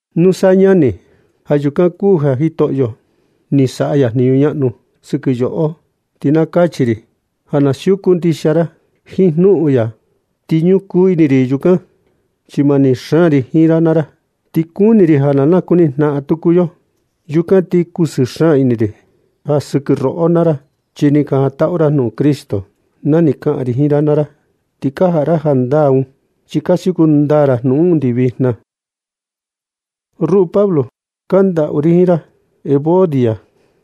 Nusa ñani, ja yukan kuu ja Jitoꞌo ni saꞌa ya ɨɨn jniñu ñaꞌnu sɨkɨ yoꞌo, ti na kachi ri ja ka siuku ndixia ra jiin jnuꞌun ya. Ti ñukuu ini ri yukan, chi mani xaan ri jiin ra naa ra, ti kuni ri ja na nakuni jnaꞌan tuku yo. Yukan ti kusɨɨ xaan ini ri ja sɨkɨ roꞌo naa ra, chi ni ka jantaꞌu ra jnuꞌun Cristo na ni kaꞌan ri jiin ra naa ra. Ti ka jaꞌa ra jandaa un, chi ka siuku ndaa ra jnuꞌun un undi vijna. Ruꞌu Pablo, kandaꞌu ri jiin ra Evodia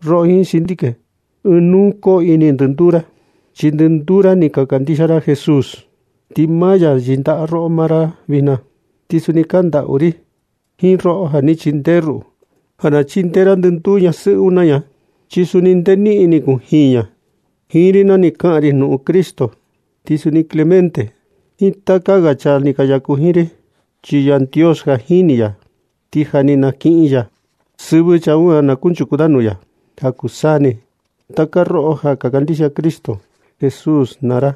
roꞌo jiin Síntique, ɨɨn nuu koo ini ndɨnduu ra, chi ndɨnduu ra ni ka kandixia ra Jesús, ti maa ya yɨndaꞌa roꞌo naa ra vijna. Ti suni kandaꞌu ri jiin roꞌo ja ni chindee ruꞌu, ja na chindee ra ndɨnduu ñasɨꞌɨ un naa ña, chi suni nde niꞌin ni kujiin ña jiin ri na ni kaꞌan ri jnuꞌun Cristo. Ti suni Clemente jiin taka ga chaa ni ka yaku jiin ri. Chi Yandios ja jini ya ti ja ni nakiꞌin ya sɨvɨ chaa un ja na kunchuku da nuu ya ja kuu taka saa ni. Taka roꞌo ja ka kandixia Cristo Jesús naa ra,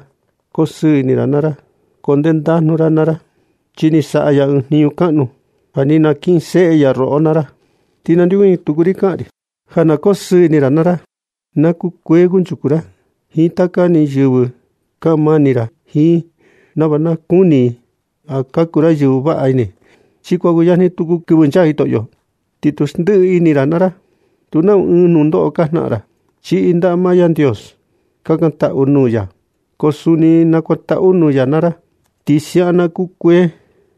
koo sɨɨ ini naa ra, koo ndendajnu naa ra, chi ni saꞌa ya ɨɨn jniñu kaꞌnu ja ni nakinseꞌe ya roꞌo naa ra. Ti nandeokuñɨ tuku ri kaꞌan ri ja na koo sɨɨ ini ra naa ra. Na kukuee kunchuku ra jiin taka ni yɨvɨ. Kaꞌan mani ra jiin i nava na kuni i ja ka kuu ra yɨvɨ vaꞌa ini. Chi kuan kuyajni kɨvɨ nchaa tuku Jitoꞌo. Ti tu xndiꞌi ra ini ra naa ra, nu nau ɨɨn nundoꞌo ka jnaꞌan ra. Chiꞌi ndaꞌa maa Yandios. Kakantaꞌu nuu ya, ko suni nakuantaꞌu nuu ya naa ra. Ti siaꞌan na kukuee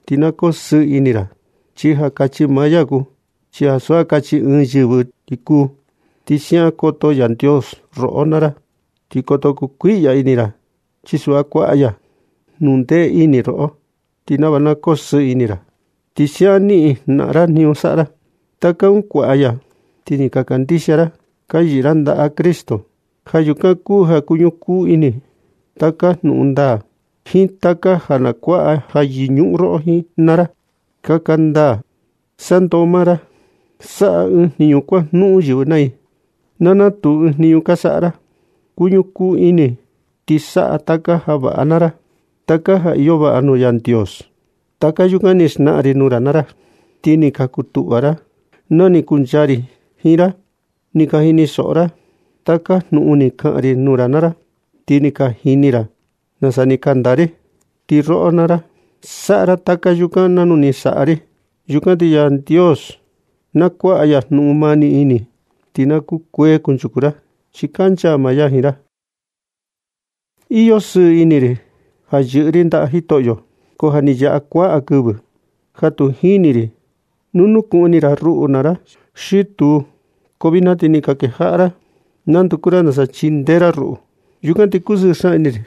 ti na kosɨɨ ini ra, chi ja kachi maa ya kuu, ti ansu ja kachi ɨɨn yɨvɨ ti kuu. Ti siaꞌan koto Yandios roꞌo naa ra, ti koto kondoꞌo kuiꞌya ini ra, chi suꞌva kuaꞌa ya jnuꞌun ndee ini roꞌo, ti nava na kosɨɨ ini ra, ti siaꞌan niꞌin jnaꞌan ra jniñu saꞌa ra. Taka un kuaꞌa ya chi ni ka kandixia ra, ti ka yɨꞌɨ ra ndaꞌa Cristo. Ja yukan kuu ja kuñukuu ini taka jnuꞌun ndaa, jiin taka ja na kuaꞌa ja yɨñuꞌun roꞌo naa ra, kaka ndaa, saꞌa ndoo maa ra, saꞌa ɨɨn jniñu kuajnuꞌun yɨvɨ naa i, na natuu ɨɨn jniñu ka saꞌa ra. Kuñukuu ini ti saꞌa taka ja vaꞌa naa ra, taka ja iyo vaꞌa nuu Yandios. Taka yukan ni xnaꞌan ri nuu ra naa ra ti ni ka kutuꞌva ra na ni kuncha ri jiin ra. Ni ka jinisoꞌo ra taka jnuꞌun ni kaꞌan ri nuu ra naa ra, ti ni ka jini ra nasa ni kanda ri. Ti roꞌo naa ra saꞌa ra taka yukan nanu ni saꞌa ri. Yukan ti Yandios na kuaꞌa ya jnuꞌun mani ini, ti na kukuee kunchuku ra chi kancha maa ya jiin ra. Iyo sɨɨ ini ri ja yɨꞌɨ ri ndaꞌa Jitoꞌyo. Ko ja ni yaꞌa kuaꞌa kɨvɨ ja tu ni jini ri nu nukuꞌun ini ra ruꞌu naa ra xi tuu. Ko vijna ti ni ka kejaꞌa ra na nduku ra nasa chindee ra ruꞌu. Yukan ti kusɨɨ xaan ini ri.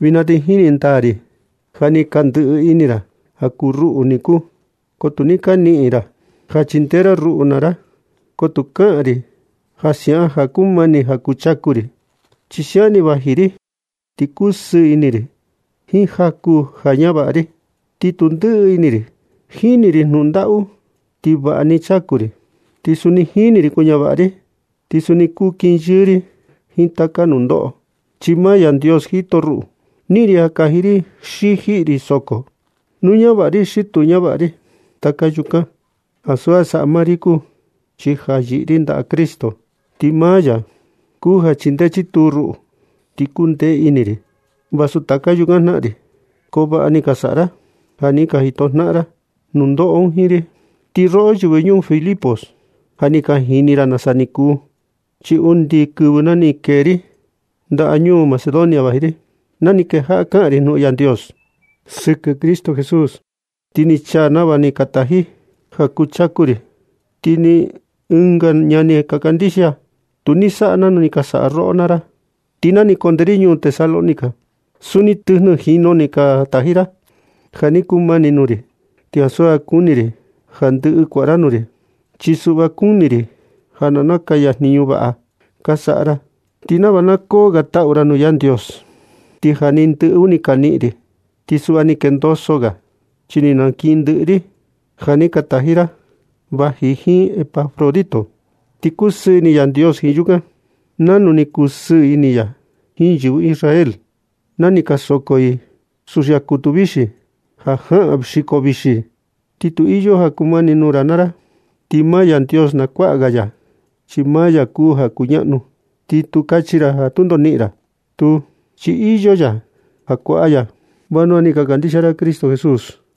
Vijna ti jini ndaa ri ja ni ka ndɨꞌɨ ini ra ja kuu ruꞌu niku, ko tu ni ka niꞌin ra ja chindee ra ruꞌu naa ra. Ko tu kaꞌan ri ja siaꞌan ja kumani ja kuu chaku ri, chi siaꞌan ni vaji ri. Ti kusɨɨ ini ri jiin jaku ja ñavaꞌa ri. Ti tu ndɨꞌɨ ini ri. Jini ri jnuꞌun ndaꞌu, ti vaꞌa ni chaku ri. Suni jini ri kuñavaꞌa ri, ti suni kuu kinyɨɨ ri jiin taka ni nundoꞌo, chi maa Yandios jito ruꞌu. Niꞌin ri ja kaji ri xi jiꞌi ri soko, nu ñavaꞌa ri xi tu ñavaꞌa ri. Taka yukan ansu ja saꞌa maa ri kuu, chi ja yɨꞌɨ ri ndaꞌa Cristo, ti maa ya kuu ja chindee chituu ruꞌu, ti kundee ini ri. Ti vasu taka yukan jnaꞌan ri, ko vaꞌa ni ka saꞌa ra ja ni ka jito jnaꞌan ra nundoꞌo un jiin ri. Ti roꞌo yɨvɨ ñuu Filipos, ja ni ka jini ra nasa ni kuu. Chi undi kɨvɨ na ni kee ri ndañuu Macedonia vaji ri, na ni kejaꞌa kaꞌan ri jnuꞌun Yandios sɨkɨ Cristo Jesús, ti ni chaa nava ja ni ka taji ra ja kuu chaku ri. Ti ni ɨnga ñani ka kandixia tu ni saꞌa nanu ni ka saꞌa roꞌo naa ra. Ti na ni kunde ri ñuu Tesalónica, suni tɨjnɨ jinu ni ka taji ra ja ni kumani nuu ri. Ti ansu kuni ri ja ndɨꞌɨ kuaꞌa ra nuu ri, chi suꞌva kuni ri ja na nakaya jniñu vaꞌa ka saꞌa ra, ti nava na koo ga taꞌu ra nuu Yandios. Ti ja ni ndɨꞌɨ un ni nakiꞌin ri, ti suꞌva ni kendoso ga, chi ni nakiꞌin ndɨꞌɨ ri ja ni ka taji ra vaji jiin Epafrodito. Ni kusɨɨ ini Yandios jiin yukan, nanu ni kusɨɨ ini ya jiin yɨvɨ Israel na ni ka soko i suxia kutu vixi ja jaꞌan xiko vixi. Ti nu iyo ja kumani nuu ra naa ra, ti maa Yandios na kuaꞌa ya, chi maa ya kuu ja kuñaꞌnu. Ti tu kachi ra ja tundo na niꞌin ra. Tuu, chi iyo ya ja kuaꞌa ya, chi vanua ni ka kandixia ra Cristo Jesús.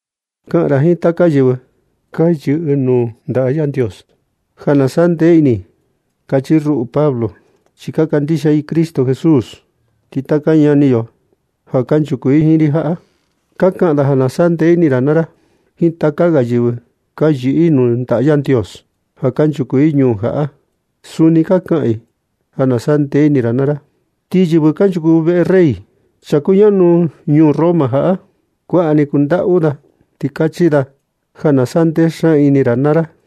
Kaꞌan ra jiin taka yɨvɨ ka yɨꞌɨ nuu ndaꞌa Yandios ja na saꞌa ndee ini i, ja kachi ruꞌu Pablo, chi ka kandixia i Cristo Jesús. Ti taka ñani yo ja kanchuku jiin ri jaꞌa, ka kaꞌan da ja na saꞌa ndee ini ra naa ra. Jiin taka ga yɨvɨ ka yɨꞌɨ nuu ndaꞌa Yandios ja kanchuku i ñuu jaꞌa, suni ka kaꞌan i ja na saꞌa ndee ini ra. Ti yɨvɨ kanchuku veꞌe rey, chaa kuñaꞌnu ñuu Roma jaꞌa, kuaꞌa ni kandaꞌu da, ti kachi da ja na sandee xaan ini ra naa ra.